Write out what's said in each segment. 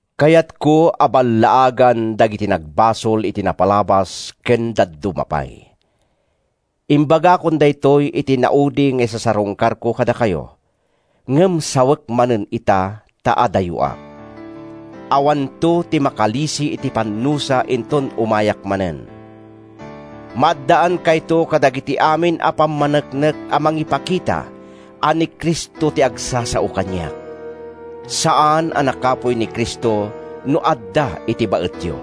Kayatko a ballaagan dagiti nagbasol iti napalabas ken dadduma pay. Imbagakon daytoy iti naudi nga isasarungkarko kadakayo, ngem sawek manen ita ta adayoak: Awanto ti makalisi iti pannusa inton umayak manen. Maaddaankayto kadagiti amin a pammaneknek a mangipakita a ni Cristo ti agsasao kaniak. Saan a nakapuy ni Cristo no adda iti baetyo.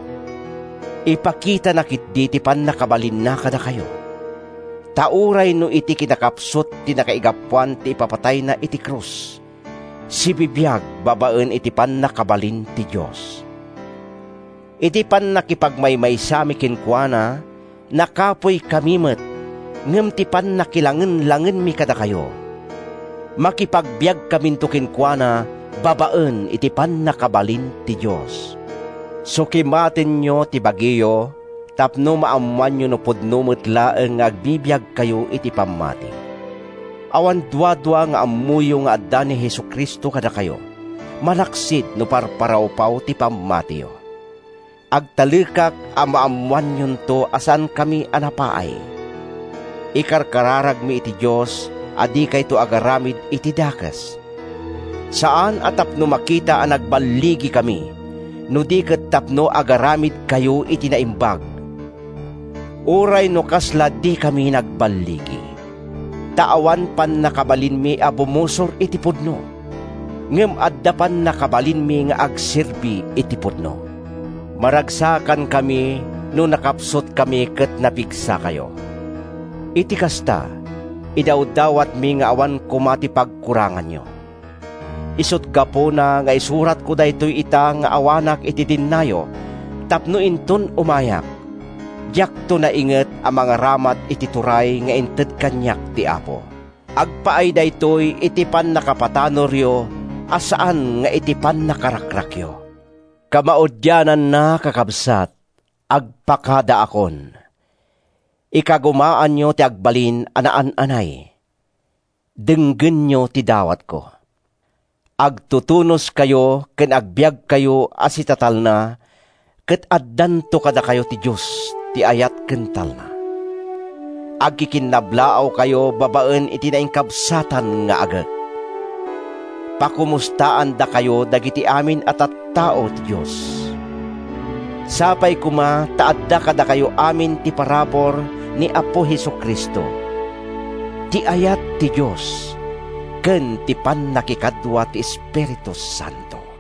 Ipakitana ketdi ti pannakabalinna kadakayo. Ta uray no iti kinakapsut ti nakaigapuan ti ipapatayna iti krus, sibibiag babaen iti pannakabalin ti Dios. Iti pannakipagmaymaysami kenkuana, nakapuykami met ngem ti pannakilangenlangenmi kadakayo, makipagbiagkaminto kenkuana babaen iti pannakabalin ti Dios. Sukimatenyo ti bagiyo tapno maammoanyo no pudno met laeng nga agbibiagkayo iti pammati. Awan duadua nga ammoyo nga adda ni Jesu-Cristo kadakayo—malaksid no parparawpaw ti pammatiyo. Agtalekak a maammoanyonto a saankami a napaay. Ikarkararagkami iti Dios a dikayto agaramid iti dakes—saan a tapno makita a nagballigikami no di ket tapno agaramidkayo iti naimbag, uray no kasla dikami nagballigikami. Ta awan pannakabalinmi a bumusor iti pudno, ngem adda pannakabalinmi nga agserbi iti pudno. Maragsakankami no nakapsutkami ket napigsakayo. Iti kasta, idawdawatmi nga awan koma ti pagkuranganyo. Isut’ gapuna nga isuratko daytoy ita nga awanak iti dennayo tapno inton umayak, diakto nainget a mangaramat iti turay nga inted kaniak ti Apo. Agpaay daytoy iti pannakapatanoryo a saan nga iti pannakarakrakyo. Kamaudiananna, kakabsat, agpakadaakon! Ikagumaanyo ti agbalin a naan-anay. Denggenyo ti dawatko: Agtutunoskayo ken agbiagkayo a sitatalna ket addanto kadakayo ti Dios ti ayat ken talna. Agkikinnablaawkayo babaen iti nainkabsatan nga agek. Pakomustaandakayo dagiti amin a tattao ti Dios. Sapay koma ta adda kadakayo amin ti parabur ni Apo Jesu-Cristo, ti ayat ti Dios, ken ti pannakikadua ti Espiritu Santo.